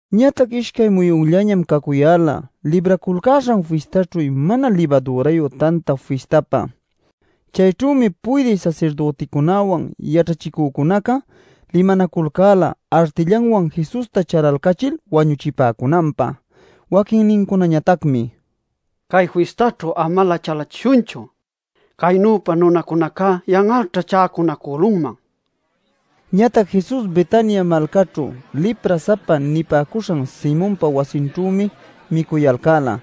Ñatac ishcay muyunllañam cacuyäla Libraculcäśhan Fistaćhu Mana Libadürayu Tanta Fistapä. Chayćhümi puydï sasirdüticunäwan, yaćhachicücunaca limanaculcäla artillawan Jesusta chalalcachil wañuchipäcunanpä. Waquinnincunañatacmi: “Cay fistäćhu amalä chalachishunchu; caynüpa nunacunacá yan'alćha chäcunacülunman” nipäcun. Ñatac Jesus Betania malcäćhu “lipra-sapa” nipäcuśhan Simonpa wasinćhümi micuyalcäla.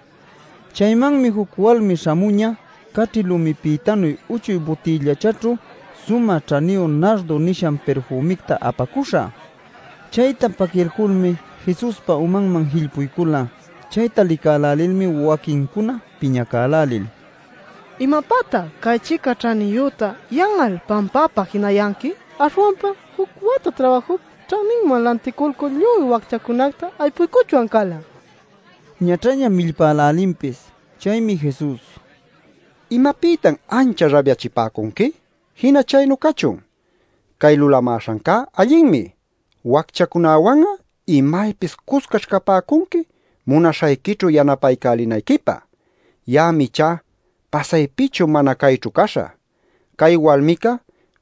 Chaymanmi juc walmi śhamuñä caćhi lumipïtanuy uchuy butïllachaćhu sumä ćhaniyu nardo nishan pirfümicta apacuśha. Chayta paquilculmi Jesuspa umanman jillpuycula. Chayta licälälilmi waquincuna piñacälälil: “¿Imapätan cay-chica ćhaniyüta yan'al pampapä jinayanqui? Aśhwanpam juc wata trabajup ćhaninman lanticulcul lluy wacchacunacta aypuycuchwan cala” nil ñaćhaña millpälälinpis. Chaymi Jesus: “¿Imapïtan ancha rabyachipäcunqui? Jina chaynu cachun. Cay lulamäśhancá allinmi. Wacchacunawan'a imaypis cuscaćh capäcunqui munaśhayquićhu yanapaycälinayquipä. Ya'am ichá pasaypichu mana cayćhu caśhä. Cay walmica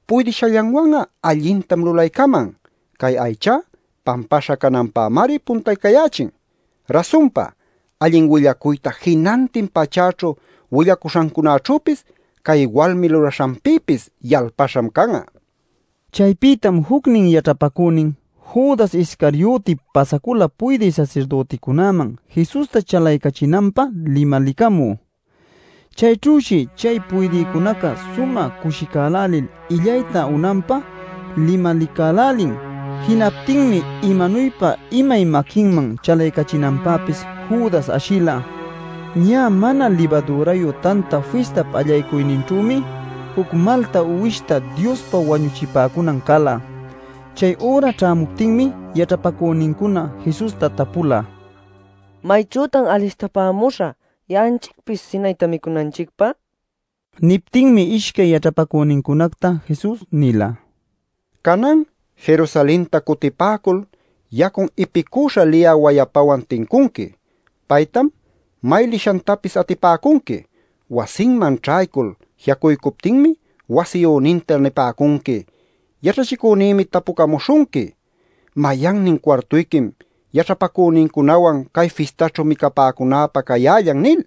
puydishallanwan'a allintam lulaycaman; cay aychá pampaśha cananpämari puntaycayächin. Rasunpa, allin willacuyta jinantin pachäćhu willacuśhancunaćhüpis, cay walmi lulaśhanpïpis yalpaśham can'a” nin. Chaypïtam jucnin yaćhapacünin Judas Iscarioti pasacula puydï sasirdüticunäman Jesusta chalaycachinanpä limalicamü. Chayćhüshi chay puydïcunaca sumä cushicälälil illayta unanpä limalicälälin. Jinaptinmi imanuypa imay maquinman chalaycachinanpäpis Judas ashila. Ñä Mana Libadürayu Tanta Fistap allaycuyninćhümi juc malta uwishta Diospa wañuchipäcunan cala. Chay üra ćhämuptinmi yaćhapacünincuna Jesusta tapula: “¿Mayćhütan alistapämuśhä ya'anchicpis sinayta micunanchicpä?” nil. Niptinmi ishcay yaćhapacünincunacta Jesus nila: “Canan Jerusalenta cutipäcul yacun ipicüśha liyä wayapawan tincunqui. Paytam may lishantapis atipäcunqui. Wasinman ćhaycul ji'acuycuptinmi wasiyüninta nipäcunqui: ‘Yaćhachicünïmi tapucamuśhunqui: “¿Mayannin cuartuyquim yaćhapacünïcunawan cay fistaćhu micapäcunäpä cayällan?” ’ nil.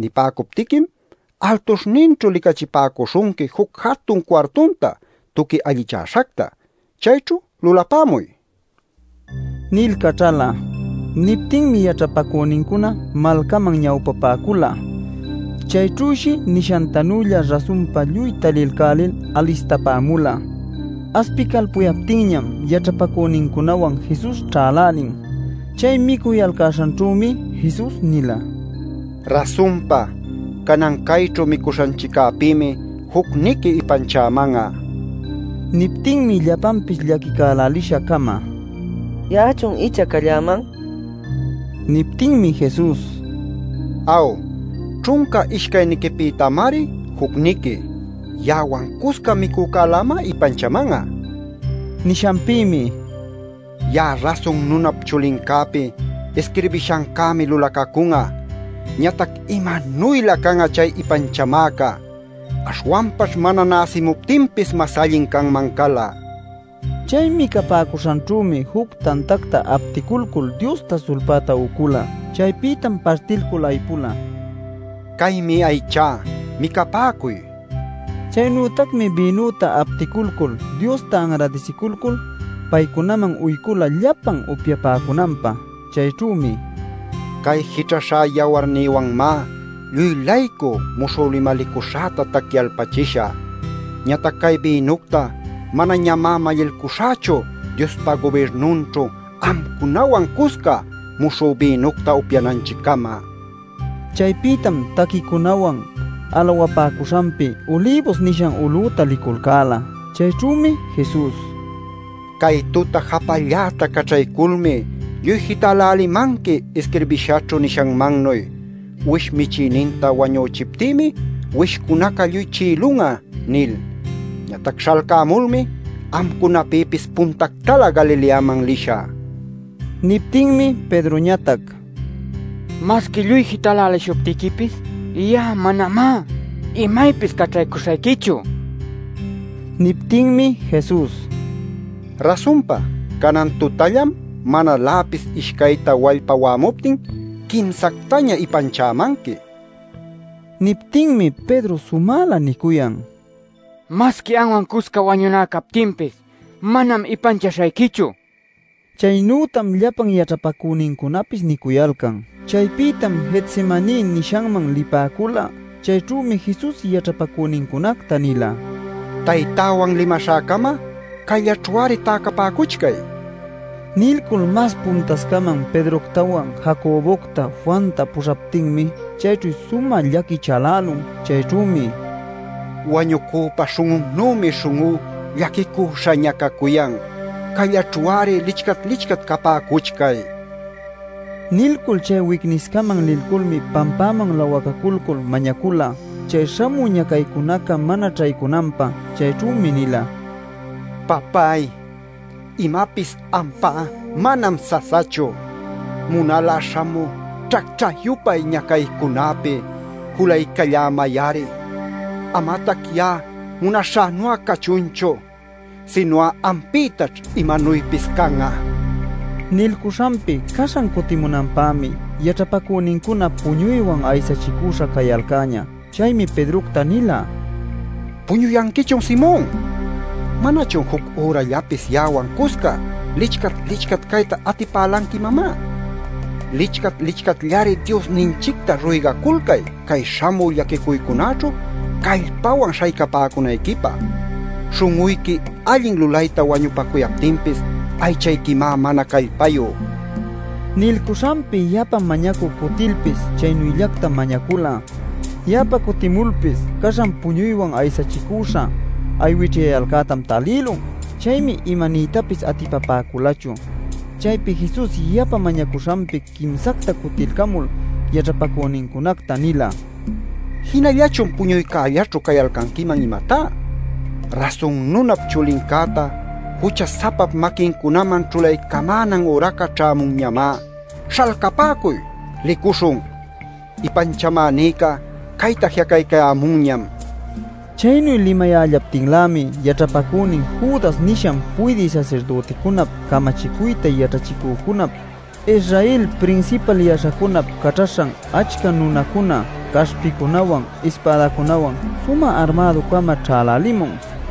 Nipäcuptiquim altuśhninćhu licachipäcuśhunqui juc jatun cuartunta tuqui allichäśhacta. Chayćhu lulapämuy” nil caćhala. Niptinmi yaćhapacünincuna malcaman ñawpapäcula. Chayćhüshi nishantanülla rasunpa lluy talilcälil alistapämula. Aspicalpuyaptinñam yaćhapacünincunawan Jesus ćhälälin. Chay micuyalcäśhanćhümi Jesus nila: “Rasunpa, canan cayćhu micuśhanchiccäpïmi jucniqui ipanchäman'a” nil. Niptinmi llapanpis llaquicälälisha-cama: “¿Ya'achun icha calläman?” nil nicuyalcan. Niptinmi Jesus: “Aw, ćhunca ishcayniquipïtamari jucniqui. Ya'awan cusca micücälämá ipanchaman'a” nin. Nishanpïmi: “Ya'a Rasun Nunap Chulincäpi isquirbishancämi lulacacun'a. Ñatac ¡imanuylä can'a chay ipanchamäca! Aśhwanpaćh mana näsimuptinpis mas allin canman cala” nin. Chay micapäcuśhanćhümi juc tantacta apticulcul Diosta sulpäta ucula. Chaypïtam partilcul aypula: “Caymi aychá. Micapäcuy” nil. Chaynütacmi bïnüta apticulcul Diosta anradisiculcul, paycunaman uycula llapan upyapäcunanpä. Chayćhümi: “Cay jićhaśha yawarnïwanmá lluy-laycu muśhü limalicuśhäta tacyalpachishä. Ñatac cay bïnucta manañamá mallilcuśhächu Diospa gubirnunćhu amcunawan cusca muśhü bïnucta upyananchiccama” nin. Chaypïtam taquicunawan alawapäcuśhanpi Ulibus nishan ulüta liculcäla. Chayćhümi Jesus: “Cay tuta japalläta caćhayculmi lluy jitälälimanqui isquirbïshaćhu nishanmannuy: ‘Uwish michïninta wañüchiptïmi uwishcunaca lluy chi'ilun'a’ nil. Ñatac śhalcämulmi amcunapïpis puntactalä Galileaman lishä” nin. Niptinmi Pedroñatac: “¡Masqui lluy jitälälishuptiquipis ya'a manamá imaypis caćhaycuśhayquichu!” nicuyan. Niptinmi Jesus: “Rasunpa canan tutallam manaläpis ishcayta wallpa wa'amuptin quimsactaña ipanchämanqui” nin. Niptinmi Pedro sumälä nicuyan: “¡Masqui anwan cusca wañuná captinpis manam ipanchaśhayquichu!” nil. Chaynütam llapan yaćhapacünincunapis nicuyalcan. Chaypïtam Getsemaní nishanman lipäcula. Chayćhümi Jesus yaćhapacünincunacta nila: “Taytäwan limaśhäcama cayllaćhu-ari täcapäcuchcay” nil. Nilcul mas puntascaman Pedroctawan, Jacobocta, Juanta puśhaptinmi chayćhu sumä llaqui chalälun. Chayćhümi: “Wañucüpä śhun'unnümi śhun'ú llaquicüśhaña cacuyan. Cayllaćhu-ari lichcat-lichcat capäcuchcay” nila. Nilcul chay wicniscaman liculmi pampäman lawacaculcul mañacula chay śhamü ñacaycunaca mana ćhaycunanpä. Chayćhümi nila: “Papáy, imapis ampá manam sasachu. Munal'a śhamü ćhacćhä-yupay ñacaycunäpi julaycallämay-ari. Amatac ya'a munaśhänu'a cachunchu sinu'a ampïtaćh imanuypis can'a” nil. Nilcuśhanpi caśhan cutimunanpämi yaćhapacünincuna puñuywan aysachicüśha cayalcäñä. Chaymi Pedrocta nila: “¿¡Puñuyanquichun, Simon!? ¿Manachun juc ürallapis ya'awan cusca lichcat-lichcat cayta atipälanqui imamá? Licchat-licchatllari Diosninchicta ruygaculcay cay śhamü llaquicuycunäćhu callpawan śhaycapäcunayquipä. Śhun'uyqui allin lulayta wañupacuyaptinpis aychayquimá mana callpayu” nil. Nilcuśhanpi yapa mañacü cutilpis chaynüllactam mañacula. Yapa cutimulpis caśhan puñuywan aysachicüśha aywićhyayalcätam talïlun. Chaymi imaniytapis atipapäculachu. Chaypi Jesus yapa mañacuśhanpi quimsacta cutilcamul yaćhapacünincunacta nila: “¿Jinallachun puñuycällaćhu cayalcanquiman, imatá? Rasun Nunap Chulincäta jucha-sapap maquincunaman ćhulaycamänan üraca ćhämunñamá. ¡Śhalcapäcuy! ¡Licuśhun! ¡Ipanchamänïca cayta ji'acaycayämunñam!” nil. Chaynu limayällaptinlämi yaćhapacünin Judas nishan puydï sasirdüticunap, camachicuyta yaćhachicücunap, Israel prinsipal yaśhacunap caćhaśhan achca nunacuna caśhpicunawan, ispädacunawan sumä armädu-cama ćhälälimun.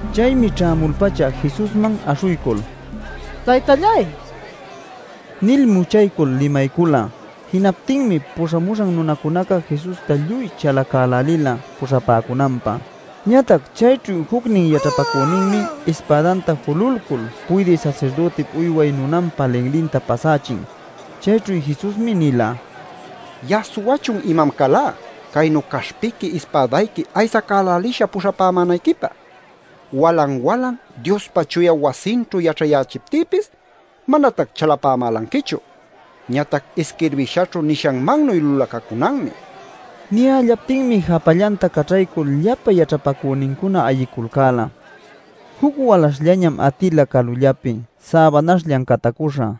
Chaymi ćhämul-pacha Jesusman aśhuycul: “Taytalláy” nil muchaycul limaycula. Jinaptinmi puśhamuśhan nunacunaca Jesusta lluy chalacälälila puśhapäcunanpä. Ñatac chayćhu jucnin yaćhapacüninmi ispädanta jululcul puydï sasirdütip uyway nunanpa linlinta pasächin. Chayćhu Jesusmi nila: “¿Ya'a suwachun imam calá caynu caśhpiqui ispädayqui aysacälälisha puśhapämänayquipä? Walan-walan Diospa chuya wasinćhu yaćhayächiptïpis manatac chalapämälanquichu. Ñatac isquirbishaćhu nishanmannuy lulacacunanmi” nil. Niyällaptinmi japallanta caćhaycul llapa yaćhapacünincuna ayiculcäla. Juc walaśhllañam atila calullapi säbanaśhllan catacüśha.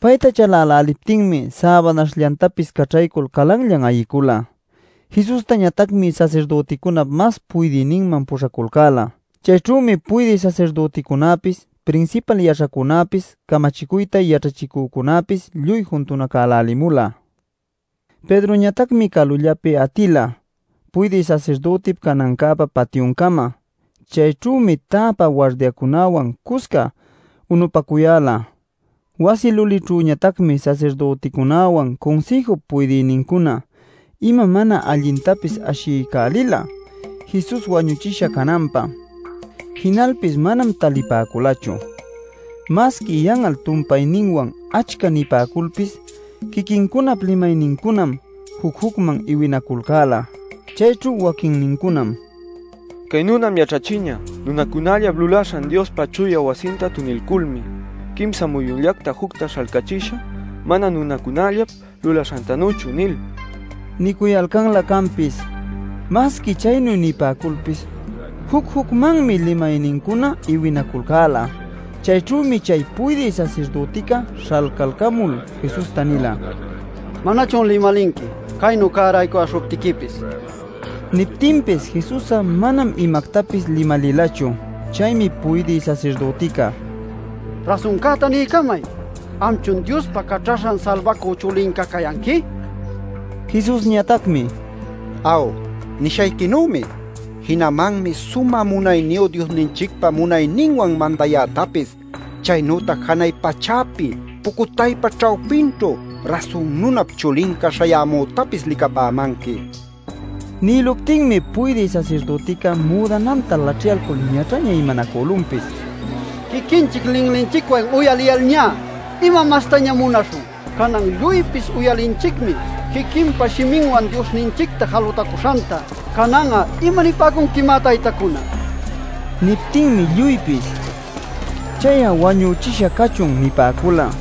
Payta chaläläliptinmi säbanaśhllantapis caćhaycul calanllan ayicula. Jesustañatacmi sasirdüticunap mas puydïninman puśhaculcäla. Chayćhümi puydï sasirdüticunäpis, prinsipal yaśhacunäpis, camachicuyta yaćhachicücunäpis lluy juntunacälälimula. Pedroñatacmi calullapi atila puydï sasirdütip canancäpa patyuncama. Chayćhümi täpä wardiacunawan cusca unupacuyäla. Wasi lulićhüñatacmi sasirdüticunäwan Cunsïjup puydïnincuna ima mana allintapis ashiycälila Jesus wañuchisha cananpä. Jinalpis manam talipäculachu. Masqui yan'al tumpayninwan achca nipäculpis quiquincunap limaynincunam juc-jucman iwinaculcäla. Chayćhu waquinnincunam: “Cay nunam yaćhachiñä: ‘Nunacunallap lulaśhan Diospa chuya wasinta tunilculmi quimsa muyunllacta jucta śhalcächishä mana nunacunallap lulaśhantanüchu’ nil” nicuyalcanlä canpis. Masqui chaynu nipäculpis juc-jucmanmi limaynincuna iwinaculcäla. Chayćhümi chay puydï sasirdütica śhalcalcamul Jesusta nila: “¿Manachun limalinqui, caynu cäraycuyäśhuptiquipis?” nil. Niptinpis Jesus'a manam imactapis limalilachu. Chaymi puydï sasirdütica: “Rasuncäta niycamay. ¿Amchun Diospa Caćhaśhan Salbacü Chulinca cayanqui?” nin. Jesusñatacmi: “Aw, nishayquinümi. Jinamanmi Sumä Munayniyu Diosninchicpa munayninwan mandayätapis, chaynütac janay pachäpi pucutaypa ćhawpinćhu Rasun Nunap Chulinca śhayämütapis licapämanqui” nin. Nïluptinmi puydï sasirdütica müdananta laćhyalcul ñaćhaña imanacülunpis: “Quiquinchic linlinchicwan uyaliyalñá, ¿ima mastañam munaśhun? Canan lluypis uyalinchicmi quiquinpa shiminwan Diosninchicta jalutacuśhanta. ¿Canan'a imanipäcunquimá, taytacuna?” nin. Niptinmi lluypis: “¡Chay'a wañuchisha cachun!” nipäcula.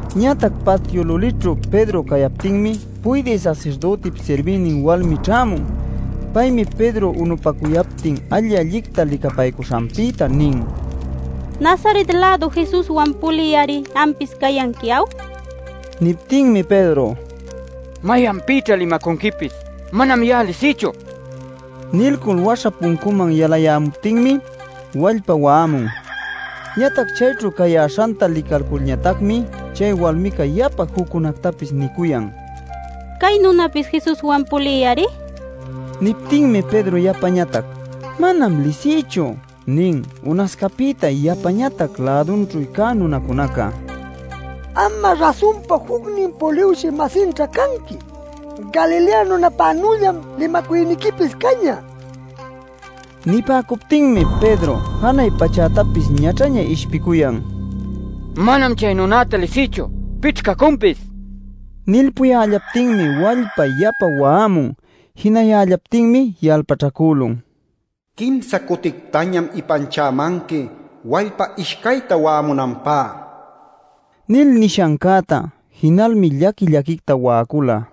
Ñatac patyu lulićhu Pedro cayaptinmi, puydï sasirdütip sirbïnin walmi ćhämun. Paymi Pedro unupacuyaptin alli-allicta licapaycuśhanpïta nin: “Nazaret-lädu Jesuswan pulï-ari ampis cayanqui ¿aw?” nil. Niptinmi Pedro: “¿Mayanpïćha limacunquipis? ¡Manam ya'a lisïchu!” nicuyan. Nilcul waśha puncuman yalayämuptinmi wallpa wa'amun. Ñatac chayćhu cayäśhanta licalculñatacmi chay walmica yapa juccunätapis nicuyan: “Cay nunäpis Jesuswan pulï-ari” nil. Niptinmi Pedro yapañatac: “Manam lisïchu” nin. Unascapïta yapañatac lädunćhu cä nunacunaca: “Am'a rasunpa jucnin puliwshï-masinćha canqui. Galilea nunäpanüllam limacuyniquipis cañä” nicuyalcan. Nipäcuptinmi Pedro janay pachätapis ñaćhaña ishpicuyan: “¡Manam chay nunacta lisïchu! ¿Pićh cacunpis?” nil. Nilpuyällaptinmi wallpa yapa wa'amun. Jinayällaptinmi yalpaćhacülun: “Quimsa cutictañam ipanchämanqui wallpa ishcayta wa'amunanpá” nil nishancäta. Jinalmi llaqui-llaquicta wa'acula.